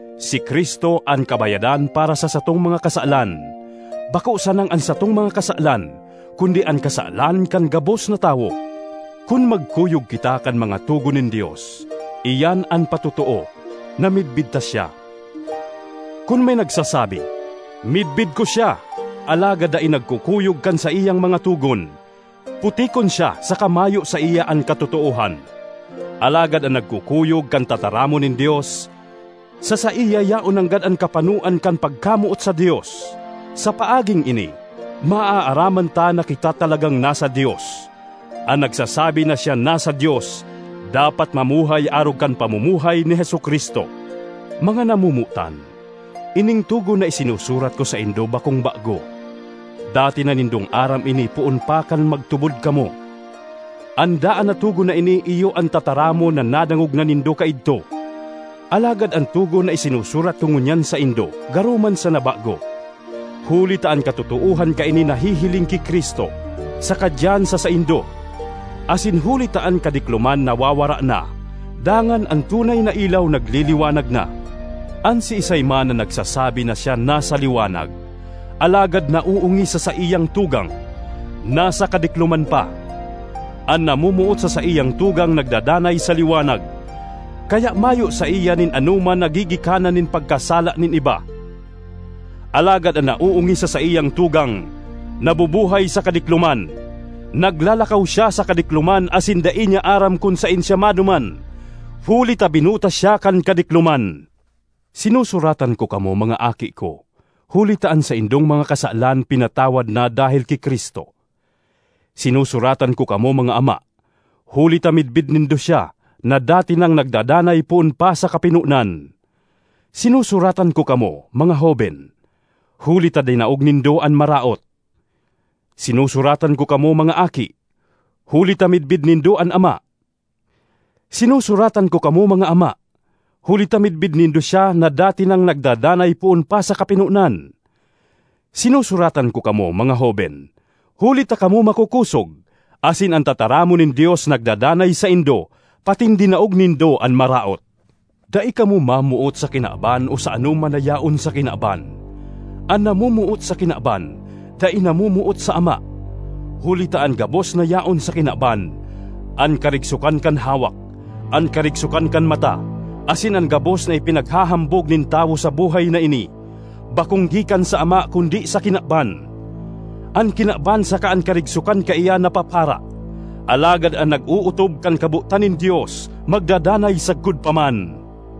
Si Cristo an kabayadan para sa satong mga kasalan, bako sanang an satong mga kasalan kundi an kasalan kan gabos na tawo. Kun magkuyog kita kan mga togon nin Dios, iyan an patotoo na midbid ta siya. Kun may nagsasabi, “Midbid ko siya,” alagad dai nagkukuyog kan saiyang mga togon, putikon siya saka mayo saiya an katotoohan. Alagad an nagkukuyog kan tataramon nin Dios, sa saiya yaon nanggad an kapanoan kan pagkamoot sa Dios. Sa paaging ini maaaraman ta na kita talagang nasa Dios; an nagsasabi na siya nasa Dios, dapat mamuhay arog kan pamumuhay ni Jesu-Cristo. Mga namomotan, ining togon na isinusurat ko saindo bakong bago; dati na nindong aram ini poon pa kan magtubod kamo. An daan na togon na ini iyo an tataramon na nadangog na nindo kaidto. Alagad an togon na isinusurat ko ngunyan saindo garo man sana bago, huli ta an katotoohan kaini nahihiling ki Cristo saka diyan sa saindo, asin huli ta an kadikloman nawawara na, dangan an tunay na ilaw nagliliwanag na. An siisay man na nagsasabi na siya nasa liwanag, alagad naoongis sa saiyang tugang, nasa kadikloman pa. An namomoot sa saiyang tugang nagdadanay sa liwanag, kaya mayo saiya nin anoman na gigikanan nin pagkasala nin iba. Alagad an naoongis sa saiyang tugang nabubuhay sa kadikloman; naglalakaw siya sa kadikloman asin dai niya aram kun saen siya maduman, huli ta binuta siya kan kadikloman. Sinusuratan ko kamo, mga aki ko, huli ta an saindong mga kasalan pinatawad na dahel ki Cristo. Sinusuratan ko kamo, mga ama, huli ta midbid nindo siya na dati nang nagdadanay poon pa sa kapinonan. Sinusuratan ko kamo, mga hoben, huli ta dinaog nindo an Maraot. Sinusuratan ko kamo, mga aki, huli ta midbid nindo an Ama. Sinusuratan ko kamo, mga ama, huli ta midbid nindo siya na dati nang nagdadanay poon pa sa kapinonan. Sinusuratan ko kamo, mga hoben, huli ta kamo makokosog asin an tataramon nin Dios nagdadanay saindo patin dinaog nindo an Maraot. Dai kamo mamoot sa kinaban o sa anoman na yaon sa kinaban. An namomoot sa kinaban, dai namomoot sa Ama. Huli ta an gabos na yaon sa kinaban—an karigsokan kan hawak, an karigsokan kan mata, asin an gabos na ipinaghahambog nin tawo sa buhay na ini—bakong gikan sa Ama kundi sa kinaban. An kinaban saka an karigsokan kaiyan napapara; alagad an nag-ootob kan kabotan nin Dios magdadanay sagkod pa man.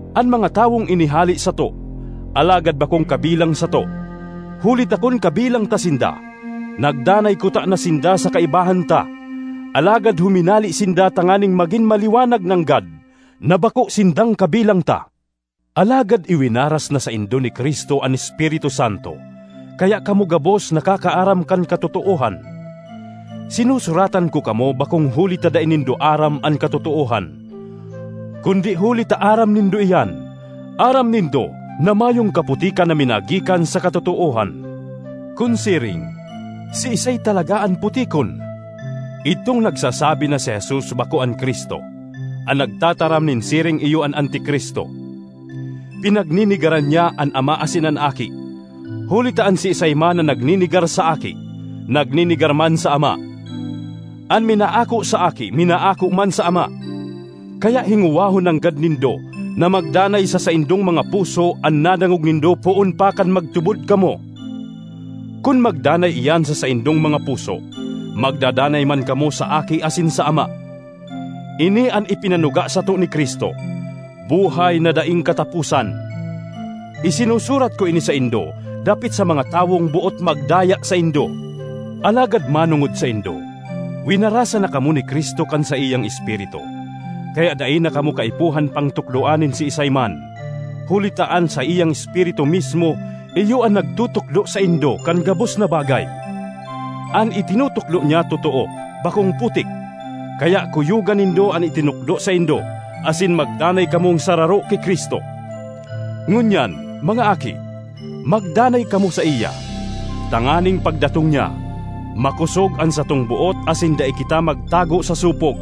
An mga tawong ini hale sato, alagad bakong kabilang sato; huli ta kun kabilang ta sinda, nagdanay kutana sinda sa kaibahan ta. Alagad huminale sinda tanganing magin maliwanag nanggad na bako sinda (sindang) kabilang ta. Alagad iwinaras na saindo ni Cristo an Espiritu Santo, kaya kamo gabos nakakaaram kan katotoohan. Sinusuratan ko kamo bakong huli ta dai nindo aram an katotoohan, kundi huli ta aram nindo iyan; aram nindo na mayong kaputikan na minagikan sa katotoohan. Kun siring, siisay talaga an putikon? Idtong nagsasabi na si Jesus bako an Cristo. An nagtataram nin siring iyo an Anti-Cristo; pinagnenegaran niya an Ama asin an Aki. Huli ta an siisay man na nagnenegar sa Aki, nagnenegar man sa Ama; an minaako sa Aki, minaako man sa Ama. Kaya hingowahon nanggad nindo na magdanay sa saindong mga puso an nadangog nindo poon pa kan magtubod kamo. Kun magdanay iyan sa saindong mga puso, magdadanay man kamo sa Aki asin sa Ama. Ini an ipinanuga sato ni Cristo—buhay na daing kataposan. Isinusurat ko ini saindo dapit sa mga tawong boot magdaya saindo. Alagad manongod saindo, winarasan na kamo ni Cristo kan saiyang Espiritu. Kaya dai na kamo kaipuhan pang tukdoan nin siisay man, huli ta an saiyang Espiritu mismo iyo an nagtutukdo saindo kan gabos na bagay; an itinutukdo niya totoo, bakong putik. Kaya kuyoga nindo an itinukdo saindo, asin magdanay kamong sararo ki Cristo. Ngunyan, mga aki, magdanay kamo saiya, tanganing pagdatong niya, makosog an satong boot asin dai kita magtago sa sopog.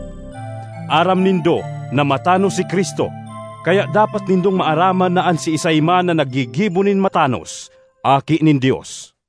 Aram nindo na matanos si Cristo; kaya dapat nindong maaraman na an siisay man na naggigibo nin matanos aki nin Dios.